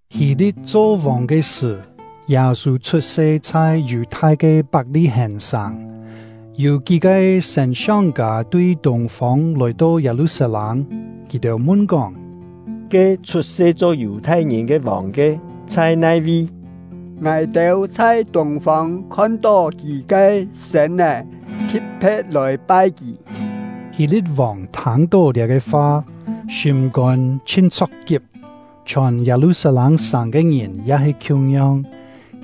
Hî-li̍t cho vòng ke sṳ̀, Yâ-sû chhut-se chhai Yù-thai ke Pak-li-hèn-sàng. Yû kí-ke sên-siong-kâ tui tûng-fông lòi-to Yâ-lu-sat-lâng; kì-têu mun-kóng: “Ke chhut-se cho Yù-thai-ngìn ke vòng ke chhai nai-vi? Ngài-têu chhai tûng-fông khon-tó kì ke sên-é, thi̍t-phe̍t lòi pai kì.” Hî-li̍t-vòng thâng-tó liá-ke fa, sîm-kôn chhin chho̍k-kip; chhiòn Yâ-lu-sat-lâng-sàng ke ngìn ya he khiung-yong.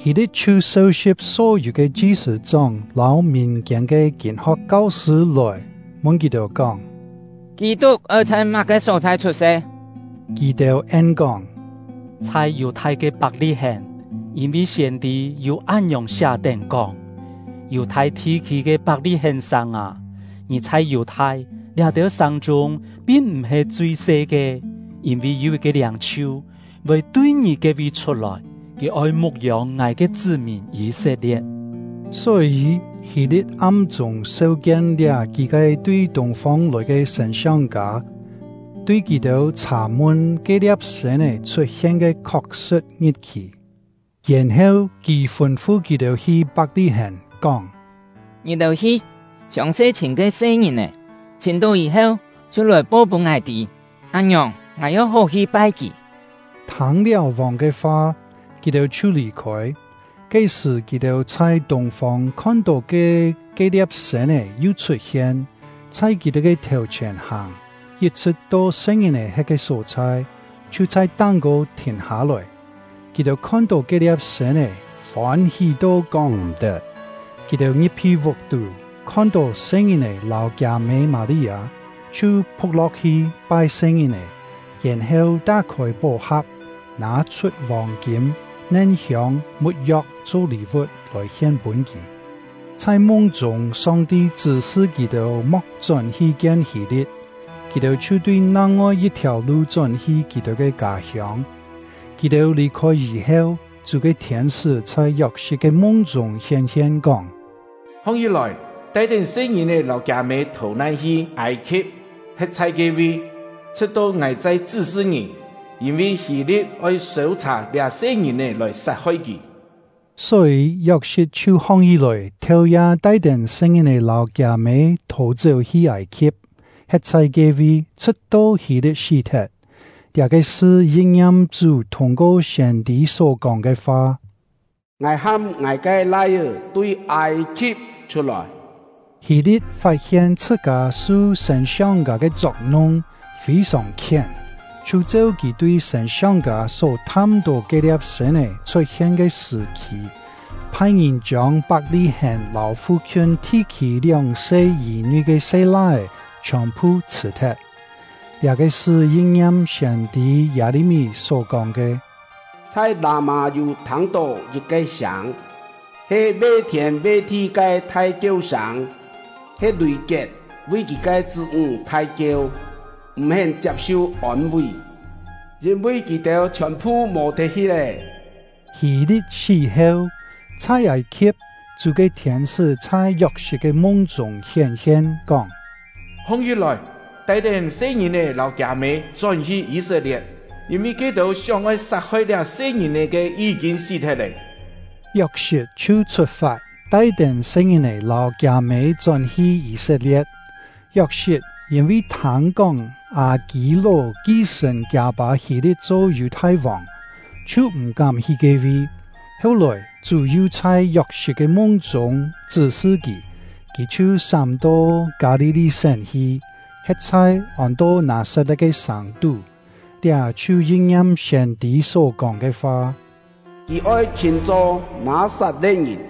Hî-li̍t chhiu seu-si̍p só-yû ke chi-sṳ̂-chóng lâu mìn-kiên ke kîn-ho̍k kau-sṳ̂ lòi, mun kì-têu kóng: “Kî-tuk oi chhai má-ke só-chhai chhut-se?” Kì-têu en-kóng: “Chhai Yù-thai ke Pak-li-hèn, yîn-vi siên-tî yû án-ngiòng siá-tén, kóng: Yù-thai thi-khî ke Pak-li-hèn-sàng â, ngì chhai Yù-thai liá-têu sàng-chûng pin m̀-he chui-se ke; yîn-vi yû yit-ke liâng-chhiu voi tui ngì ke-vi chhut-lòi, kì oi mu̍k-yông Ngài ke chṳ́-mìn Yî-set-lie̍t.” Só-yî, Hî-li̍t am-chûng seu-kien liá kí-ke tui tûng-fông lòi ke sên-siong-kâ, tui kì-têu chhà-mun ke-lia̍p sên-é chhut-hien ke khok-sṳ̍t ngit-khì. Yèn-heu kì fûn-fu kì-têu hi Pak-li-hèn, kóng: “Ngì-têu hi, siòng-se chhìm ke se-ngìn-è, chhìm-tó yî-heu chhiu lòi po-pûn ngài tî, án-ngiòng ngài ya hó hi-pai kì.” Thâng-liáu vòng ke fa, kì-têu chhiu lì-khôi. Ke-sṳ̀, kì-têu chhai tûng-fông khon-tó ke ke-lia̍p sên-é yu chhut-hien, chhai kì-têu ke thèu-chhièn hàng, yit-chhṳ̍t to se-ngìn-è he̍t ke só-chhai, chhiu chhai táng-kô thìn hâ-lòi. Kì-têu khon-tó ke-lia̍p sên-é, fôn-hí to kóng m̀-tet. Kì-têu ngi̍p-hi vuk-tú, khon-tó se-ngìn-è lâu kiâ-mê Mâ-li-â, chhiu phu̍k lo̍k-hi pai se-ngìn-è, yèn-heu tá-khôi pó-ha̍p, nâ-chhut vòng-kîm, nen-hiông, mu̍t-yo̍k cho lî-vu̍t lòi hien-pûn kì. Chhai mung-chûng, Song-ti chṳ́-sṳ kì-têu mo̍k chón-hi kien Hî-li̍t; kì-têu chhiu tui nang-ngoi yit-thiàu lu chón-hi kì-têu ke kâ-hiông. Kì-têu lì-khôi yî-heu, Chú ke thiên-sṳ́ chhai Yok-sit ke mung-chûng hién-hien, kóng: “Hong-hí-lòi! Tai-tén se-ngìn-è lâu kiâ-mê thò-nan hi Âi-khi̍p, he̍t chhai ke-vi, chhṳ̍t-to ngài chai chṳ́-sṳ ngì; yîn-vi Hî-li̍t oi sêu-chhà liá se-ngìn-è lòi sat-hoi kì.” Só-yî, Yok-sit chhiu hong-hí-lòi, theu-ya tai-tén se-ngìn-è lâu kiâ-mê thò-chéu hi Âi-khi̍p, he̍t chhai ke-vi, chhṳ̍t-to Hî-li̍t sí-thet. Liá-ke sṳ yin-ngiam Chú thûng-ko siên-tî só-kóng ke fa: “Ngài ham ngài ke Lai-é tui Âi-khi̍p chhut-lòi.” Hî-li̍t fat-hien chhṳ-kâ su sên-siong-kâ ke chok-nung, fî-sòng khién, chhiu cheu kì tui sên-siong-kâ só tham-tó ke-lia̍p sên-é chhut-hien ke sṳ̀-khì, phai-ngìn chiông Pak-li-hèn lâu fu-khiun thi-khî lióng-se yî-nui ke se-lai-é chhiòn-phu chhṳ̀-thet. Liá-ke sṳ yin-ngiam siên-tî Yâ-li-mí só-kóng ke: Chhai Lâ-mâ yû thâng-tó yit-ke sâng, he ve-thiên ve-thi ke thai-kieu sâng; he Lùi-kiet vi kì ke chṳ́-ńg thai-kieu, m̀-hén chiap-su ôn-ví, yîn-vi kì-têu chhiòn-phu mò-thet-hi lé. Hî-li̍t sí-heu, chhai Âi-khi̍p, Chú ke thiên-sṳ́ chhai Yok-sit ke mung-chûng hién-hien, kóng: “Hong-hí-lòi! Tai-tén se-ngìn-è lâu kiâ-mê chón-hi Yî-set-lie̍t, yîn-vi ke-têu sióng-oi sat-hoi liá se-ngìn-è ke yí-kîn sí-thet lé.” Yok-sit chhiu chhut-fat, tai-tén se-ngìn-è lâu kiâ-mê chón-hi Yî-set-lie̍t. Yok-sit yîn-vi thâng-kóng Â-kî-ló ki-sṳ̀n kiâ-pâ Hî-li̍t cho Yù-thai-vòng, chhiu m̀-kám hi ke-vi. Heu-lòi, Chú yu chhai Yok-sit ke mung-chûng chṳ́-sṳ kì, kì chhiu sám-to Kâ-li-li-sén hi, he̍t chhai ôn-to Nâ-sat-le̍t ke sàng-tú. Liá chhiu yin-ngiam siên-tî só-kóng ke fa: “Kì oi chhṳ̂n-cho Nâ-sat-le̍t-ngìn.”